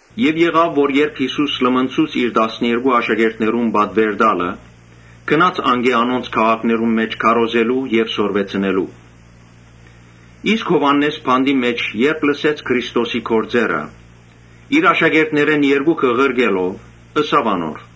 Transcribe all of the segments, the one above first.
Երբ Յիսուս լմնցուց իր տասներկու աշակերտներուն պատուէր տալը, գնաց անոնց քաղաքներուն մէջ քարոզելու եւ սորվեցնելու։ Յովհաննէս բանտին մէջ երբ լսեց Քրիստոսի գործերը, իր աշակերտներէն երկուքը ղրկելով՝ հարցուց անոր.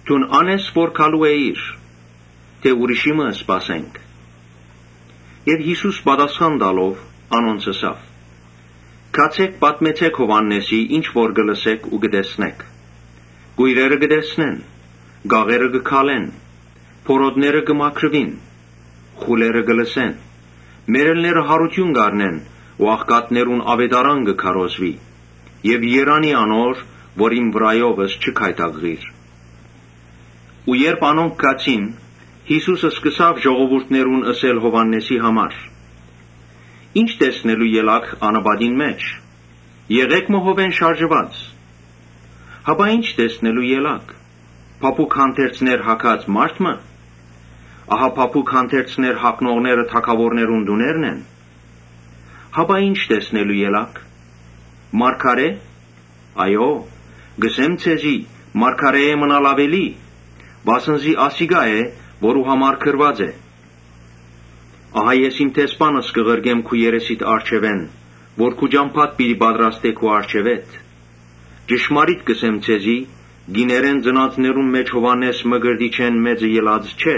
«Դուն ա՞ն ես, որ գալու էր, թէ ուրիշի մը սպասենք»։ Յիսուս պատասխան տալով՝ անոնց ըսաւ. «Գացէք պատմեցէք Յովհաննէսին ինչ որ կը լսէք ու կը տեսնէք. Կոյրերը կը տեսնեն, կաղերը կը քալեն, բորոտները կը մաքրուին, խուլերը կը լսեն, մեռելները յարութիւն կ’առնեն ու աղքատներուն աւետարան կը քարոզուի։ Երանի՜ անոր որ իմ վրայովս չի գայթակղիր»։ Երբ անոնք գացին, Յիսուս սկսաւ ժողովուրդին ըսել Յովհաննէսին համար. «Ի՞նչ տեսնելու ելաք անապատին մէջ. եղէ՞գ մը հովէն շարժուած։ Հապա ի՞նչ տեսնելու ելաք. փափուկ հանդերձներ հագած մա՞րդ մը. ահա փափուկ հանդերձներ հագնողները թագաւորներուն տուներն են։ Հապա ի՞նչ տեսնելու ելաք. մարգարէ՞։ Այո՛, կ’ըսեմ ձեզի, մարգարէէ մըն ալ աւելի։ Վասն զի ասիկա է՝ որու համար գրուած է. ‘Ահա ես իմ դեսպանս կը ղրկեմ քու երեսիդ առջեւէն, որ քու ճամբադ պիտի պատրաստէ քու առջեւէդ’։ Ճշմարիտ կ’ըսեմ ձեզի, Կիներէն ծնածներուն մէջ Յովհաննէս Մկրտիչէն մեծը ելած չէ.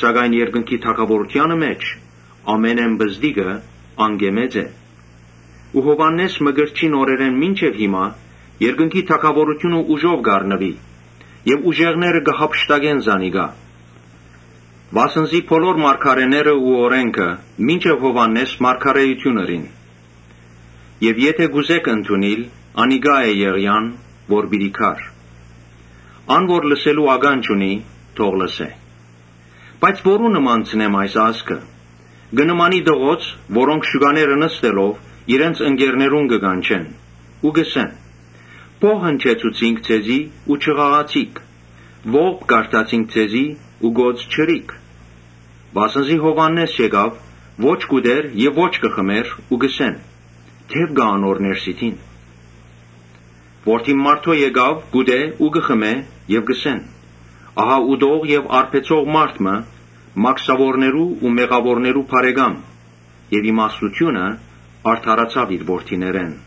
սակայն երկնքի թագաւորութեանը մէջ ամենէն պզտիկը անկէ մեծ է։ Ու Յովհաննէս Մկրտչին օրերէն մինչեւ հիմա երկնքի թագաւորութիւնը ուժով կ’առնուի եւ ուժեղները կը յափշտակեն զանիկա։ Վասն զի բոլոր մարգարէները ու օրէնքը մինչեւ Յովհաննէս՝ մարգարէութիւն ըրին։ Եթէ կ’ուզէք ընդունիլ, անիկա է Եղիան՝ որ պիտի գար։ Ան որ լսելու ականջ ունի, թող լսէ։ Բայց որո՞ւ նմանցնեմ այս ազգը։ Կը նմանի տղոց, որոնք շուկաները նստելով՝ իրենց ընկերներուն կը կանչեն, Ու կ’ըսեն. ‘Փող հնչեցուցինք ձեզի ու չխաղացիք, ողբ կարդացինք ձեզի՝ ու կոծ չըրիք’։ Վասն զի Յովհաննէս եկաւ, ո՛չ կ’ուտէր եւ ո՛չ կը խմէր, ու կ’ըսէին. ‘Դեւ կայ անոր ներսիդին’։ Որդին մարդոյ եկաւ, կ’ուտէ ու կը խմէ եւ կ’ըսեն. ‘Ահա ուտող եւ արբեցող մարդ մը, մաքսաւորներու ու մեղաւորներու բարեկամ’։ Իմաստութիւնը արդարացաւ իր որդիներէն»։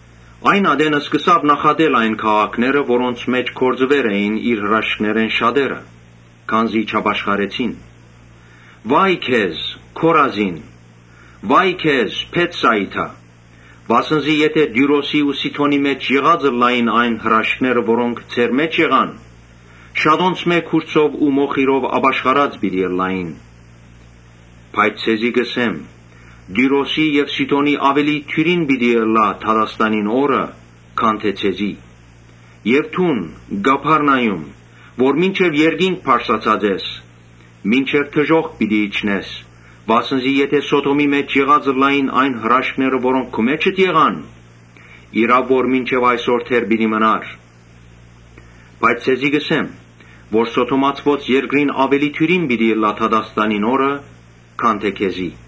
Այն ատեն սկսաւ նախատել այն քաղաքները, որոնց մէջ կատարեր էր իր հրաշքներէն շատերը, քանզի չապաշխարեցին. «Վա՜յ քեզի, Քորազին, վա՜յ քեզի Բեթսայիդա, վասն զի եթէ Տիւրոսի ու Սիդոնի մէջ եղած ըլլային այն հրաշքները, որոնք ձեր մէջ եղան, շատոնցմէ քուրձով ու մոխիրով ապաշխարած պիտի ըլլային։ Բայց ձեզի կ’ըսեմ, Տիւրոսի եւ Սիդոնի աւելի դիւրին պիտի ըլլայ դատաստանին օրը՝ քան թէ ձեզի։ Եւ դո՛ւն, Կափառնայում, որ մինչեւ երկինք բարձրացած ես, մինչեւ դժոխք պիտի իջնես, վասն զի եթէ Սոդոմի մէջ եղած ըլլային այն հրաշքները, որոնք քու մէջդ եղան, իրաւ որ մինչեւ այսօր դեռ պիտի մնար։ Բայց ձեզի կ’ըսեմ թէ Սոդոմացիներու երկրին աւելի դիւրին պիտի ըլլայ դատաստանին օրը՝ քան քեզի»։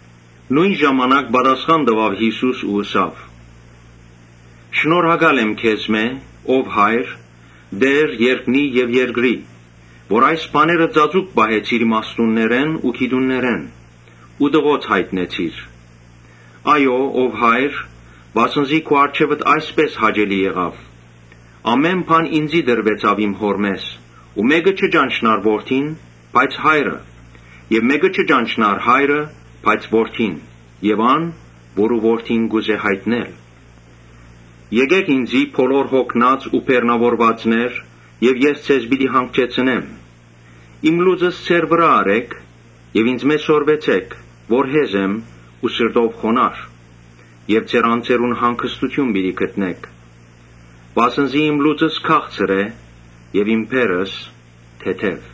Նոյն ժամանակ Յիսուս ըսաւ. «Շնորհակալ եմ քեզմէ, ո՛վ Հայր, Տէր երկնի եւ երկրի, որ այս բաները ծածուկ պահեցիր իմաստուններէն ու գիտուններէն ու տղոց յայտնեցիր։ Այո՛, ո՛վ Հայր, վասն զի քու առջեւդ այսպէս հաճելի եղաւ։ Ամէն բան ինծի տրուեցաւ իմ Հօրմէս ու մէկը չի ճանչնար Որդին, բայց Հայրը եւ մէ՛կը չի ճանչնար Հայրը, բայց Որդին եւ ան՝ որուն Որդին կ’ուզէ յայտնել։ Եկէ՛ք ինծի, բոլոր յոգնած ու բեռնաւորուածներ եւ ես ձեզ պիտի հանգչեցնեմ։ Իմ լուծս ձեր վրայ առէք եւ ինծմէ սորվեցէք՝ որ հեզ եմ ու սրտով խոնարհ եւ ձեր անձերուն հանգստութիւն պիտի գտնէք. Վասն զի իմ լուծս քաղցր է եւ իմ բեռս թեթեւ»։